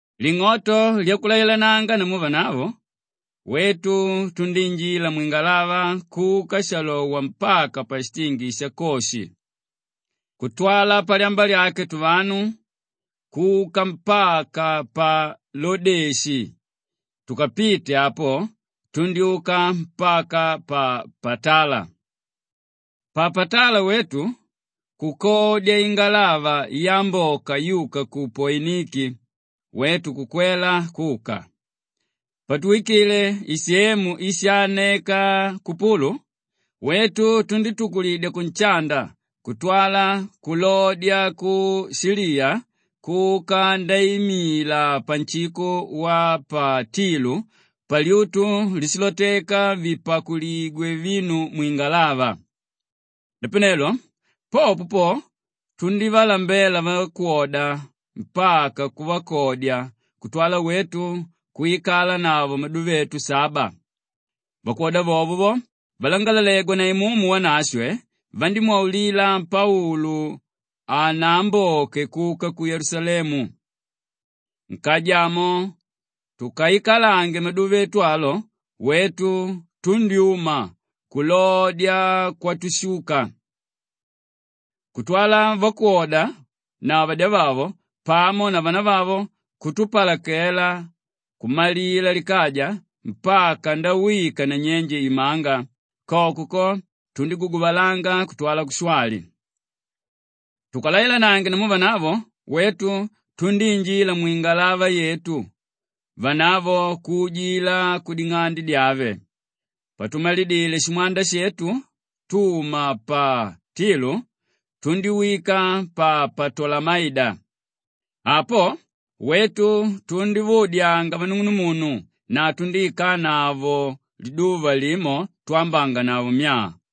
Ling'oto lyakulailananga namu vanavo, wetu tundíinjila mwingalava kuka shalowa mpaka pashitingi sha Koshi. Kutwala palyamba lyake tuvanu kuka mpaka pa Lodeshi, tukapite apo tundyúka mpaka pa Patala. Pa Patala wetu kukodya ingalava yamboka yuka ku Poiniki, wetu kukwela kuka. Patuwikile isemu íshaaneka Kupulu, wetu tundítukulidya kunshanda kutwala kulodya ku Shiliya kuka ndaimila panshiko wa pa Tilu palyutu líshiloteka vipakuligwe vinu mwingalava. Napanelo popo po, tundívalambela vakwoda mpaka kuvakodya kutwala wetu kwikalanavo maduva etu saba. Vakwoda vovo vo, valangalalegwa na Imumu Wanashwe vandímwaulila Paulu hanaamboke kuka ku Yelusalemu. Nkaja amo tukaikalange maduva etu alo, wetu tundyúma kulodya kwatushuka. Kutwala vakwoda na vadyavavo pamo na vanavavo kutupalakela kumalila likaja mpaka ndawika nanyenje imanga; koko ko, tundíguguvalanga kutwala kushwali. Tukalailanange namu vanavo, wetu tundíinjila mwingalava yetu, vanavo kuujila kuding'ande dyave. Patumalidile shimwanda shetu tuma pa Tilu, tundíwika pa Patolamaida. Apo, wetu tundívaudyanga vanung'unumunu na tundíikalanavo liduva limo twambanganavo myaa.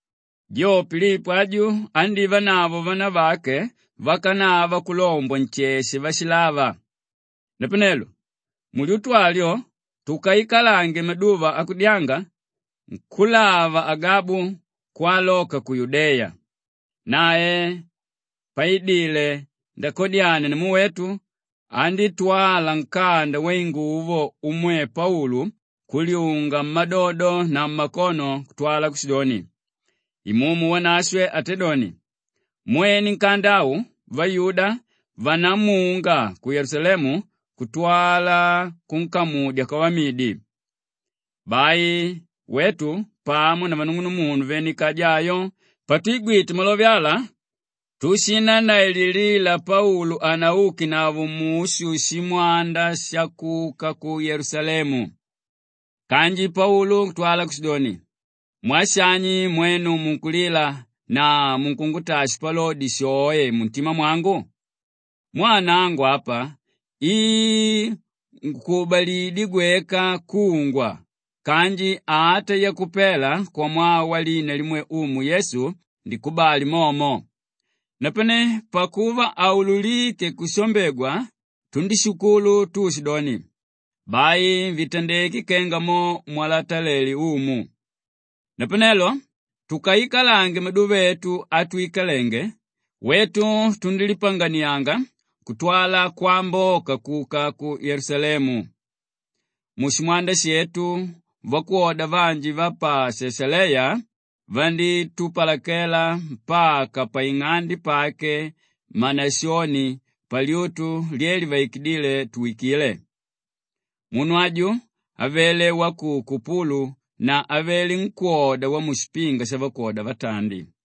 Jo Pilipo aju andívanavo vanavake vakanava kulombwa nsheshe váshilava. Napanelo mulyutu alyo tukaikalange maduva akudyanga, nkúlava Agabu kwaloka ku Yudeya. Nae paidile ndakadyania namu wetu, andítwala nkanda wainguvo umwe Paulu kulyunga mmadodo na mmakono kutwala kushidoni, “Imumu Wanashwe atédoni, ‘Mwene nkanda au vayuda vandamunga ku Yelusalemu kutwala kunkamudya kwavamidi.’” Bai wetu pamo na vanung'unumunu vene kaja ayo, patwigwite malove ala tushinannaililila Paulu hanaukenavo mushu shimwanda shakuka ku Yelusalemu. Kanji Paulu kutwala kushidoni, “Mwaa shani mwenu munkulila na munkungutaa shipalodi shoe muntima mwangu? Mwaa nangu apa i ngukubalidyé gweka kungwa kanji ata yakupela kwamwaa walina limwe Umu Yesu, ndikubali momo.” Napane pakuva haululíke kushambegwa, tundíshukulu tuushidoni, “Bai vitandeke kenga mo mwalatela Umu.” Napanelo tukaikalange maduva etu atwikalenge, wetu tundílipanganiyanga kutwala kwamboka kuka ku Yelusalemu. Mushimwanda shetu vakwoda vanji va pa Shashaleya vandítupalakela mpaka paing'ande pake Manashoni, palyutu lye livaikidíle tuwikile. Munu aju avele wa ku Kupulu na avele nkwóda wamushipinga shavakwoda vatandi.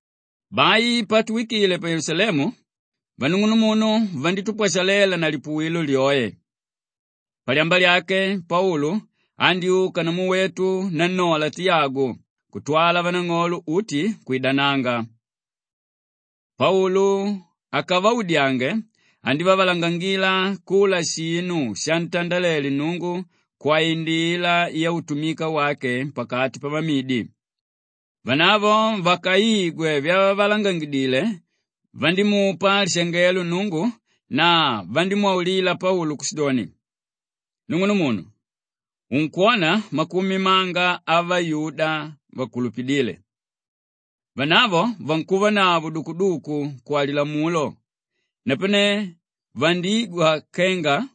Bai patuwikile pa Yelusalemu, vanung'unumunu vandítupwashalela na lipuwilo lyoe. Palyamba lyake Paulu andyúka namu wetu nannola Tiyagu kutwala vanang'olo uti kwidananga. Paulu akavaudyange, andívavalangangila kula shinu shantandalele Nnungu kwaindila yautumika wake pakati pavamidi. Vanavo vakaigwe vyavavalangangidile, vandímupa lishangelo Nnungu na vandímwaulila Paulu kushidoni, “Nung'unumunu, unkwona makumi manga avayuda vakulupidíle. Vanavo vankuvanavo dukuduku kwa Lilamulo, napane vandigwa kenga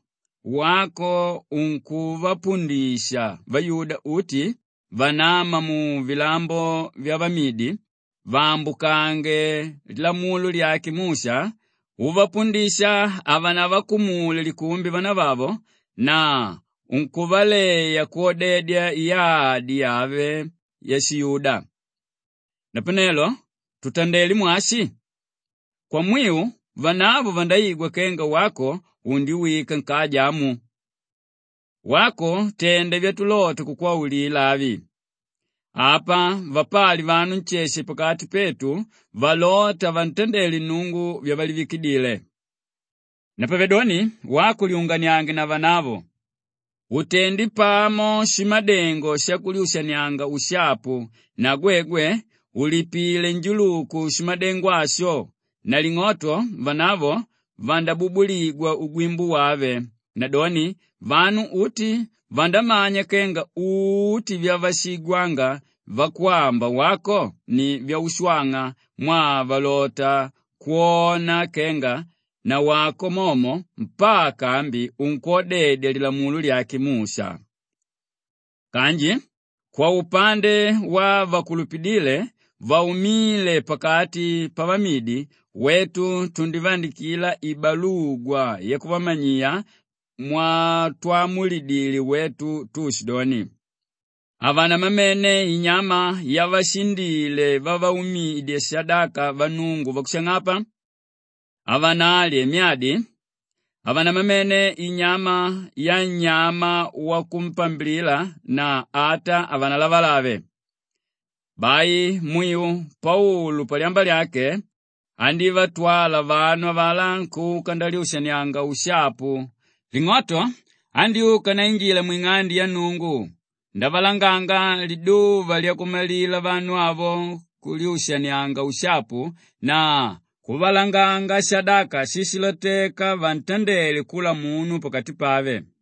wako unkuvapundisha vayuda uti vanáma muvilambo vyavamidi vaambukange lilamulo lyake Musha uvapundisha havanavakumule likumbi vanavavo na unkuvaleya kwodedya yadi yave yashiyuda. Napanelo tutandelé mwashi? Kwamwiu vanavo vandaigwa kenga wako undiwika nkaja amu. Wako tenda vyatulota kukwaulila avi: apa vapali vanu nsheshe pakati petu valóta vantandele Nnungu vyavalivikile. Napavedoni wako lyunganiange na vanavo utende pamo shimadengo shakulyushanianga ushapu na gwegwe ulipile njuluku shimadengo asho na ling'oto vanavo vandabubuligwa ugwimbo wave; nadoni, vanu uti vandamanya kenga uti vyavashiigwanga vakwamba wako ni vyaushwang'a mwaa valota kwona kenga nawako momo mpaka ambi unkwodedya Lilamulo lyake Musha. Kanji kwaupande wavakukulupila vaumíle pakati pavamidi, wetu tundivaandikila ibalugwa yakuvamanyiya mwatwamulidile wetu tuushidoni, ‘Havanamamene inyama yavashindile vavaumidya shadaka vannungu vakushang'apa, havanalye myadi, havanamamene inyama yannyama wakumpambilila na ata havanalavalave.’” Bai mwiu Paulu palyamba lyake andívatwala vanu avalá kuka ndalyushanianganavo ushapu; ling'oto andyúka ndainjila mwing'ande ya Nnungu ndavalanganga liduva lyakumalila vanu avo kulyushanianga ushapu na kuvalanganga shadaka shíshiloteka vantandele kula munu pakati pave.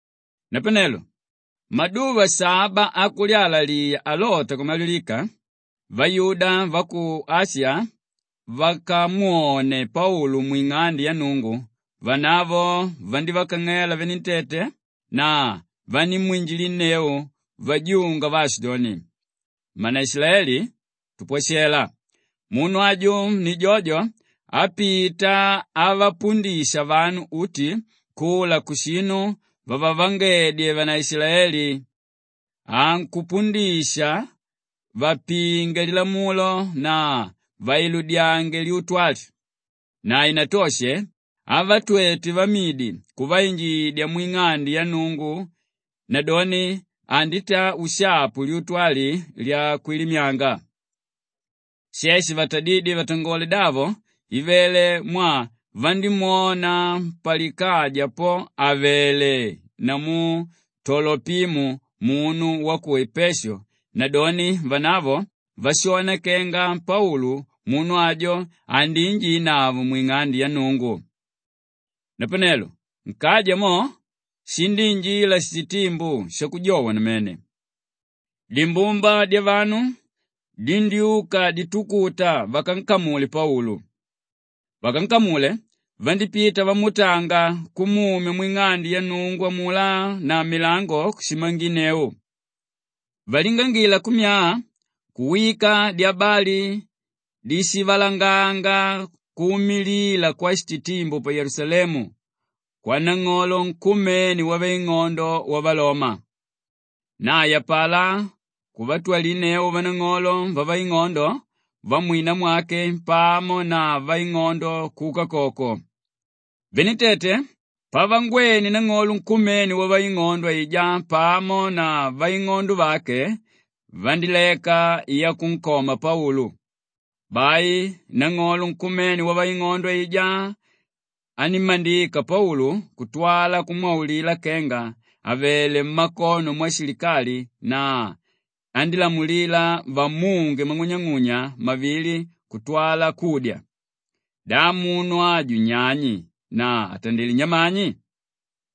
Napanelo maduva saba akulyalaliya alota kumalilika, vayuda va ku Ashiya vakamwone Paulu mwing'ande ya Nnungu vanavo vandívakang'ela venentete na vanímwinjilinneu vajunga vaashidoni, “Mmanaishilaeli, tupwashela! Munu aju ni jojo ápita avapundisha vanu uti kula kushinu vavavangedye vanaishilaeli; ankupundisha vapinge Lilamulo na vailudyange lyutu ali. Na hainatoshe avatwete vamidi kuvainjidya mwing'ande ya Nnungu nadoni anditaa ushapu lyutu ali lyakwilimyanga.” She shivatadídye vatangole davo ivele mwaa vandímwona palikaja po àvele namu Tolopimu munu wa ku Epeshu nadoni vanavo vashona kenga Paulu munu ajo andiinjinavo mwing'ande ya Nnungu. Napanelo nkaja mo shindíinjila shititimbu shakujowa namene. Dimbumba dyavanu dindyúka ditukuta vakankamule Paulu. Vakankamule vandípita vamuutanga kumumya mwing'ande ya Nnungu amulá na milango vandíshimanginneu. Valingangila kummyaa, kuwika dyabali dishivalanganga kuumilila kwashititimbu pa Yelusalemu kwanang'olo nkumene wavaing'ondo wavaloma. Nae apalá kuvatwalinneu vanang'olo vavaing'ondo vamwina mwake pamo na vaing'ondo kuka koko. Venentete pavangwene nang'olo nkumene wavaing'ondo aijá pamo na vaing'ondo vake, vandíleka yakunkoma Paulu. Bai nang'olo nkumene wavaing'ondo aijá anímmandika Paulu kutwala kumwaulila kenga avele mmakono mwashilikali na andílamulila vamunge mang'unyang'unya mavili kutwala kudya, “Da munu aju nyani na atandilé nyamani?”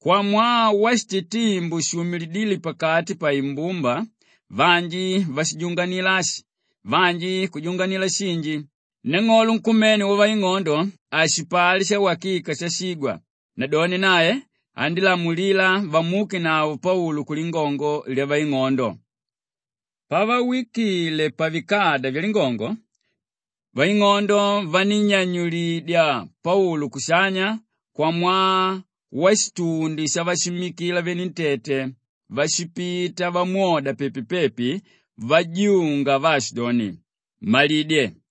Kwamwaa washititimbu shuumilidíle pakati paimbumba vanji vajunganila ashi vanji kujunganila shinji, nang'olo nkumene wavaing'ondo hashipali shawakika shashigwa nadoni nae andílamulila vamuukenavo Paulu kulingongo lyavaing'ondo. Pavawikile pavikada vyalingongo, vaing'ondo vanínnyanyulidya Paulu kushanya kwamwaa washitundi shavashimmikila venentete váshipita vamwoda pepi-pepi vajunga vaashidoni, “Mmalidye!”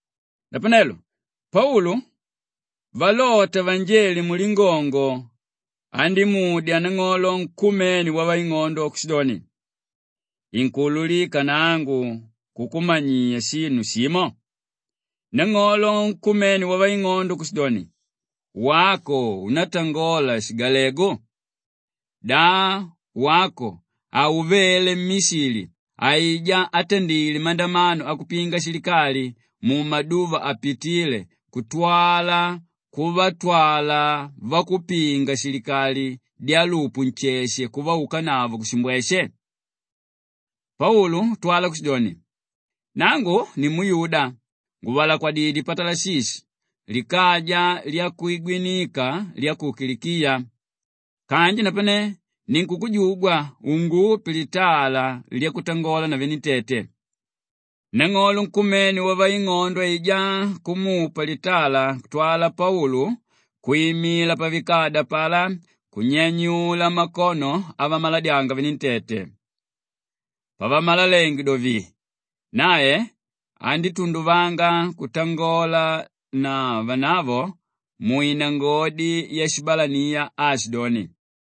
Napanelo Paulu valota vanjele mulingongo andímudya nang'olo nkumene wavaing'ondo kushidoni, “Inkuululika nangu kukumanyiya shinu shimo?” Nang'olo nkumene wavaing'ondo kushidoni, “Wako unátangola shigalegu? Da wako hauvele mmishili aijá átandile mandamano akupinga shilikali mumaduva apitíle kutwala kuvatwala vakupinga-shilikali dyalupu nsheshe kuvaukanavo kushimbweshe?” Paulu kutwala kushidoni, “Nangu nimuyuda nguvalakwidyé pa Talashishi likaja lyakwigwinika lya ku Kilikiya. Kanji napane ninkukujugwa ungupe litala lyakutangola na venentete.” Nang'olo nkumene wavaing'ondo aijá kumupa litala kutwala Paulu kwimila pavikada apalá kunyanyula makono avamaladyanga venentete. Pavamalalenge do vii, nae andítunduvanga kutangola na vanavo mwinangodi yashibalaniya aashidoni,